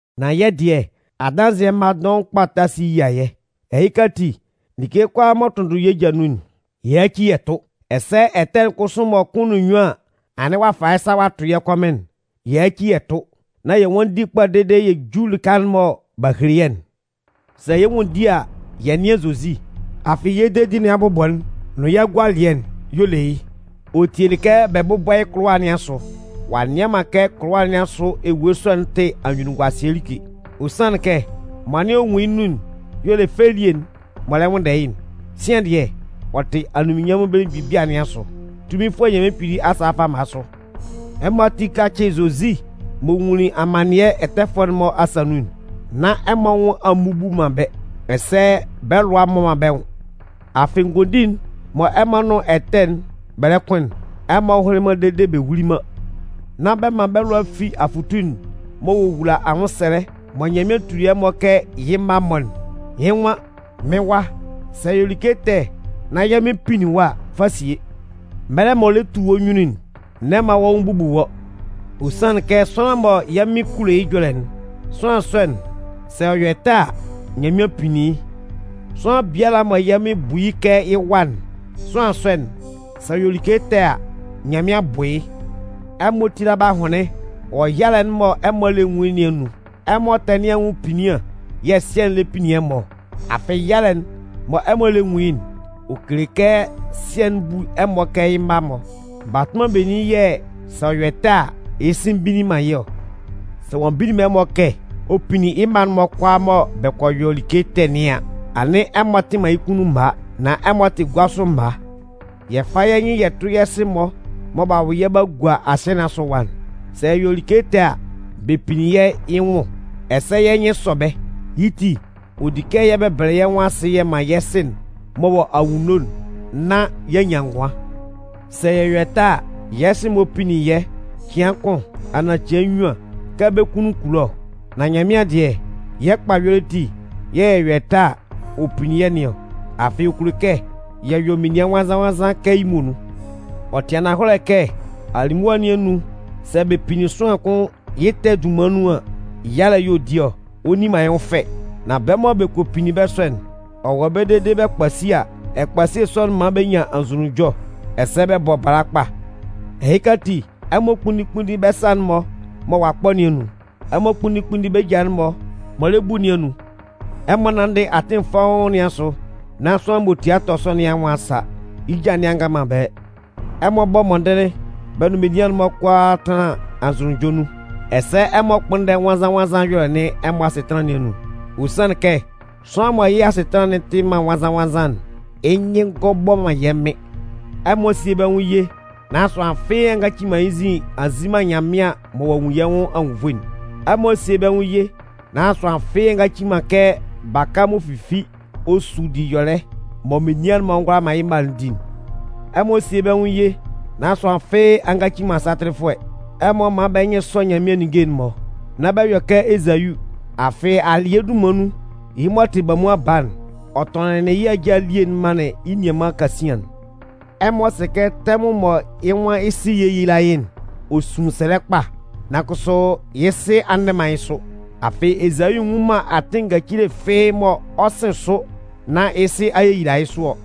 Nan yɛ́ dɩɛ, adanzɩɛ mma dɔʋn kpa ta si yia yɛ́. Ɛhɩka ati, like kʋalaa m'ɔ tʋnndʋn yɛ́ ja nun'n, yɛ yáci yɛ tʋ́. Ɛsɛ ɛtɛ'n kʋsʋ mɔ kʋn nʋn nnyuan an anɩn ɔ'a fa yɩ́ sa ɔ a tʋ yɛ́ kɔmɩn'n, yɛ yáci yɛ tʋ́. Nan yɛ nwánndi kpa dede yɛ jú lɩka'n mɔ b'a hele yɛ́'n. Sɛ yɛ 'nwanndi a, yɛ nɩ́an Zozi. Afɩ yɛ́ dedi nɩn abʋbɔ'n nʋn yɩ́ agualɩɛ'n y'ɔ le yɩ́. Ɔ tielɩ kɛ bɛ bʋ́bɔ yɩ́ kʋlʋwa nɩn asʋ, ɔ'a nnɩan man kɛ kʋlʋwa nɩn asʋ ewue sɔ'n tɩ anyunnunguasɩɛ like. Ɔ sanlɩn kɛ mɔ anɩn ɔ nwun yɩ́ nun'n y'ɔ le fɛ elie'n m'ɔ lɛ nwʋnndɛ yɩ́'n. Sian dɩɛ, ɔ tɩ anunminnyanmʋn belemgbin bia nɩn asʋ, Tunminfʋɛ Nyanmɩan Kpili asa fama sʋ. Ɛmɔ ati kácɩ Zozi m'ɔ nwunlin amannɩɛ ɛtɛfʋɛ'n-mɔ asa nun'n, nán ɛmɔ anwʋn a mmubu man bɛ́, ɛsɛ bɛ́ lʋa a mmɔ man bɛ́ nwʋn. Afɩ ngondin'n mɔ ɛmɔ nʋn ɛtɛ'n bɛ lɛ kʋn'n, ɛmɔ hʋnlɩn man dede bɛ wuli man. Nán bɛ man bɛ́ lʋa fi afʋtu'n m'ɔ wowula anwʋnsɛlɛ mɔ Nyanmɩan tuli ɛmɔ kɛ yɩ́ mma-mɔ'n. Yɩ́ nwan: Mɩ́n wa, sɛ ɛ yɔ like ɛtɛ nán yɛ́ Mɩn pinnin wɔ́ a, fa sie. Mɛlɛ m'ɔ lɛ tu wɔ́ nyunnun'n, n'ɛ man wɔ́ nwʋn bubu wɔ́. Ɔ sanlɩn kɛ sʋanlan mɔ yɛ́ Mɩn kulo yɩ́ ɛjɔlɛ'n, sʋanlan sɔ'n, sɛ ɔ yɔ ɛtɛ a, Nyanmɩan pinnin yɩ́. Sʋanlan biala mɔ yɛ́ Mɩn bu yɩ́ kɛ yɩ́ wa'n, sʋanlan sɔ'n, sɛ ɔ yɔ like ɛtɛ a, Nyanmɩan bʋ yɩ́. Ɛmɔ tíla bɛ́ ahʋnlɩn wɔ yalɛ'n mɔ ɛmɔ lɛ nwun yɩ́ nɩn anun. Ɛmɔ ɛtɛ nɩn anwʋn epinnian yɛ̂ Sɩɛ'n lɛ pinnin ɛmɔ ɔ. Afɩ yalɛ'n mɔ ɛmɔ lɛ nwun yɩ́'n, ɔ kele kɛ Sɩɛ'n bu ɛmɔ kɛ yɩ́ mma-mɔ. Batʋnman benin yɛ̂ sɛ ɔ yɔ ɛtɛ a, yɩ́ sɩ mbinnin man yɩ́ ɔ? Sɛ ɔ'a mbinnin man ɛmɔ kɛ ɔ pinnin yɩ́ mma'n-mɔ kʋalaa mɔ bɛ kɔ yɔ like ɛtɛ nɩn an, anɩn ɛmɔ tɩ man yɩ́ kunnun mma, nan ɛmɔ tɩ gua sʋ mma. Yɛ fá yɛ́ nyɩn yɛ tʋ́ yɛ́ sɩ-mɔ mɔ b'a wʋ yɛ́ b'a gua asɩɛ nɩn asʋ ɛwa'n. Sɛ yɛ yɔ like ɛtɛ a, bɛ pinnin yɛ́ yɩ́ nwʋn, ɛsɛ yɛ́ nyɩn sɔ bɛ́. Yɩ́ ti, ɔ di kɛ yɛ bɛbɛlɛ yɛ́ nwʋn asɩ yɛ man yɛ́ Sɩ'n m'ɔ wɔ anwunno'n nán y'a nyan ngʋan. Sɛ yɛ yɔ ɛtɛ a, yɛ́ sɩ-mɔ pinnin yɛ́ cɩan kʋn anaan cɩan nnyuan kɛ bɛ́ kunnun kulo ɔ. Nan Nyanmɩan dɩɛ, yɛ́ kpa ɛyɔlɛ ati yɛ̂ yɛ yɔ ɛtɛ a, ɔ pinnin yɛ́ nɩn ɔ. Afɩ ɔ kulo kɛ yɛ yɔ menian nwannzan-nwannzan kɛ yɩ́ muonun. Ɔ tɩ ananhɔlɛ kɛ alimʋa nɩn anun, sɛ bɛ pinnin sʋanlan kʋn yɩ́ ɛtɛ'n dunman nun an, yalɛ y'ɔ di ɔ, ɔ nni man yɩ́ nwʋn fɛ. Nan bɛ́ mɔ bɛ kɔ pinnin bɛ́ sɔ'n, ɔ wɔ ɛbɛlɛ dede bɛ kpasi a, ɛkpasie sɔ'n man bɛ nyan anzʋnunjɔ, ɛsɛ bɛ bɔ abalabɔ kpa. Ɛhɩka ati, ɛmɔ kpúnndin kpúnndin bɛ́ sa'n-mɔ mɔ ɔ'a kpɔ nɩn anun. Ɛmɔ kpúnndin kpúnndin bɛ́ ja'n-mɔ m'ɔ lɛ bu nɩn anun. Ɛmɔ nánndɩ atɩn fɔ́ʋ́n nɩn asʋ nán sʋanlan m'ɔ tia tɔ sʋ nɩn anwʋn a sa yɩ́ ja nɩn a nga man ɛbɛlɛ. Ɛmɔ bɔ́ mɔndɩnlɩn bɛ nʋn menian'n-mɔ kʋalaa tánlan anzʋnunjɔ nun. Ɛsɛ ɛmɔ kpʋ́nndɛ nwannzan-nwannzan ɛyɔlɛ nɩn ɛmɔ asɩtanlan nɩn anun. Ɔ sanlɩn kɛ sʋanlan mɔ yɩ́ asɩtanlan'n tɩ man nwannzan-nwannzan'n, yɩ́ nyɩn ngɔ bɔ man yɛ́ Mɩn. Ɛmɔ síe bɛ́ nwʋn ye nán sʋanlan fɩ́ɩ́ a ngaci man yɩ́ nzin ɔ'a nzi man Nyanmɩan mɔ ɔ'a nwun yɩ́ nwʋn anwunnvoe'n. Ɛmɔ síe bɛ́ nwʋn ye nán sʋanlan fɩ́ɩ́ a ngaci man kɛ baka m'ɔ fifi ɔ su diyɔlɛ mɔ menian'n-mɔ ngʋala man yɩ́ mma'n di'n. Ɛmɔ síe bɛ́ nwʋn ye nán sʋanlan fɩ́ɩ́ a ngaci man satɩlɩfʋɛ. Ɛmɔ mán bɛ́ nyɩn sɔ́ Nyanmɩan ninnge'n-mɔ, nan nán bɛ yɔ kɛ Ezayu. Afɩ alɩɛ dunman nun, yɩ́ m'ɔ tɩ bamuan baa'n, ɔ tɔnɩnlɩn yɩ́ ajâ elie'n manlɩn yɩ́ nianman kasian'n. Ɛmɔ sɩ kɛ tɛmʋn mɔ yɩ́ nwan yɩ́ sɩ yéyila yɩ́'n, ɔ sunlin sɛlɛ kpa, nan kʋsʋ yɩ́ sɩ a ndɛ man yɩ́ sʋ. Afɩ Ezayu nnwun man atɩn ngacili fɩ́ɩ́ mɔ ɔ 'sɩn sʋ nán yɩ́ sɩ a yeyila yɩ́ sʋ ɔ.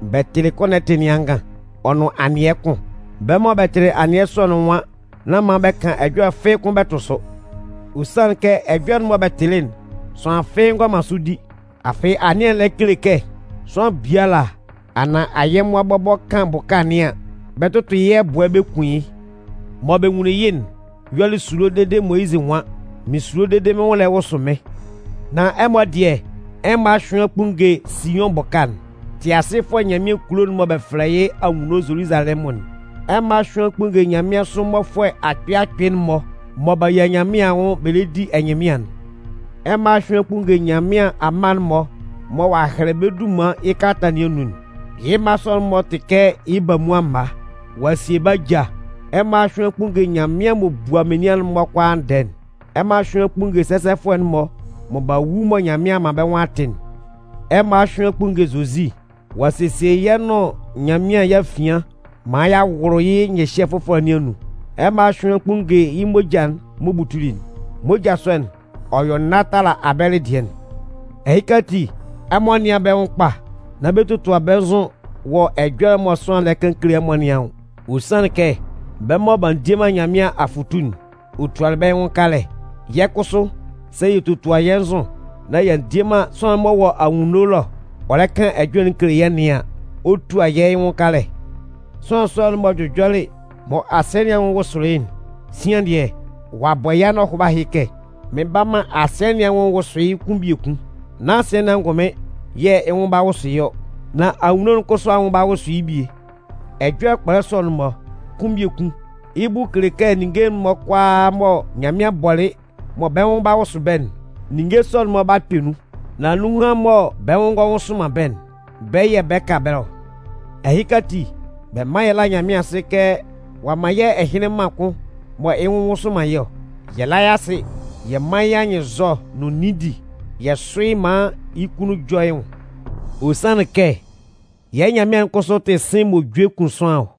Bɛ tɩlɩ kɔnɔti nɩn angan ɔ nʋn anɩɛ kʋn. Bɛ́ mɔ bɛ tɩlɩ anɩɛ sɔ'n nwan nán man bɛ kan ɛjɔlɛ fɩ́ɩ́ kʋ́n bɛ tʋ sʋ. Ɔ sanlɩn kɛ ɛjɔlɛ'n mɔ bɛ tɩlɩ'n, sʋanlan fɩ́ɩ́ ngʋala man sʋ di. Afɩ anɩɛ'n lɛ kele kɛ: Sʋanlan biala, anaan ayɛmʋa bɔbɔ kan bʋka nɩn an, bɛ 'tʋtʋ yɩ́ ɛbʋɛ bɛ kun yɩ́. Mɔ bɛ nwunlin yɩ́'n yɔlɩ esulo dede Moyizɩ nwan: Mɩn sulo dede mɩ́n nwʋn lɛ wʋsʋ mɩ́n. Nan ɛmɔ dɩɛ, ɛmɔ a hyʋɩn a kpunnge Siʋn bʋka'n, Tɩasɩfʋɛ Nyanmɩan kulo'n mɔ bɛ fɛlɛ yɩ́ anwunno Zoluzalɛmʋn'n. Ɛmɔ a hyʋɩn a kpunnge nyanmɩansʋ mmɔfʋɛ akpɩɩ akpɩɩ'n-mɔ mɔ b'a yia Nyanmɩan anwʋn bɛ lɛ di ɛnyɩnmɩan'n. Ɛmɔ a hyʋɩn a kpunnge Nyanmɩan amma'n-mɔ mɔ ɔ'a hɛlɛ bɛ́ dunman yɩ́ kalata nɩn anun'n. Yɩ́ mma sɔ'n-mɔ tɩ kɛ yɩ́ bamuan mma. Ɔ'a sie bɛ́ ajâ. Ɛmɔ a hyʋɩn a kpunnge Nyanmɩan m'ɔ bua menian'n-mɔ kʋalaa ndɛɛ'n. Ɛmɔ a hyʋɩn a kpunnge sɛsɛfʋɛ'n-mɔ mɔ b'a wu mɔ Nyanmɩan a man bɛ́ nwʋn a tɩ'n. Ɛmɔ a hyʋɩn a kpunnge Zozi. Ɔ'a sesie yɛ́ nʋn Nyanmɩan yɛ́ afian maan y'a wʋlʋ yɩ́ nyɩhyɛ fʋfɔlɛ nɩn anun. Ɛmɔ a hyʋɩn a kpunnge yɩ́ moja'n m'ɔ butuli'n. Moja sɔ'n, ɔ yɔ nâ tala Abɛlɩ dɩɛ'n. Ɛhɩ ati, ɛmɔ nɩ́an bɛ́ nwʋn kpa! Nán bɛ totua bɛ́ nzʋ wɔ ɛjɔlɛ'n mɔ sʋanlan'n lɛ kan kele ɛmɔ nɩn anwʋn. Ɔ sanlɩn kɛ bɛ́ mɔ b'a ndie Nyanmɩan afʋtu'n, ɔ tualɩ bɛ́ yɩ́ nwʋn kalɛ. Yɛ́ kʋsʋ, sɛ yɛ totua yɛ́ nzʋ nán y'a ndie man sʋanlan'n m'ɔ wɔ anwunno ɛlɔ ɔ lɛ kan ɛjɔlɛ'n kele yɛ́ nɩn an, ɔ 'tua yɛ́ yɩ́ nwʋn kalɛ. Sʋanlan sɔ'n m'ɔ jʋjɔlɩ mɔ asɩɛ nɩn anwʋn wʋsʋlɩ yɩ́'n, sian dɩɛ, ɔ'a bɔ yɛ́ anɔhʋba ɛhɩ kɛ: Mɩn 'ba man asɩɛ nɩn anwʋn wʋsʋ yɩ́ kʋn biekun. Nán asɩɛ nɩn angʋnmɩn yɛ̂ yɩ́ nwʋn 'ba wʋsʋ yɩ́ ɔ, nán anwunno'n kʋsʋ anwʋn 'ba wʋsʋ yɩ́ bie. Ɛjɔlɛ kpɔlɛ sɔ'n-mɔ: “kʋn biekun,” yɩ́ bʋ kele kɛ ninnge'n-mɔ kʋalaa mɔ Nyanmɩan bɔlɩ mɔ bɛ́ nwʋn 'ba wʋsʋ bɛ́'n, ninnge sɔ'n-mɔ 'ba kpɛ nun. Nan nunhan mɔ bɛ́ nwʋn ngɔ nwʋsʋ man bɛ́'n, bɛ́ yɛ̂ bɛ 'ka ɛbɛlɛ ɔ. Ɛhɩka ati, bɛ mán yɛ lá Nyanmɩan asɩ kɛ ɔ'a man yɛ́ ɛhɩnlɩn mân kʋn mɔ yɩ́ nwʋn nwʋsʋ man yɩ́ ɔ. Yɛ lá yɩ́ asɩ yɛ mán yɩ́ anyɩnnzɔ nʋn nindi, yɛ sʋ́ yɩ́ maan yɩ́ kunnun jɔ yɩ́ nwʋn. Ɔ sanlɩn kɛ yɛ́ Nyanmɩan'n kʋsʋ tɩ sɩ̂n m'ɔ jue kun sʋanlan ɔ.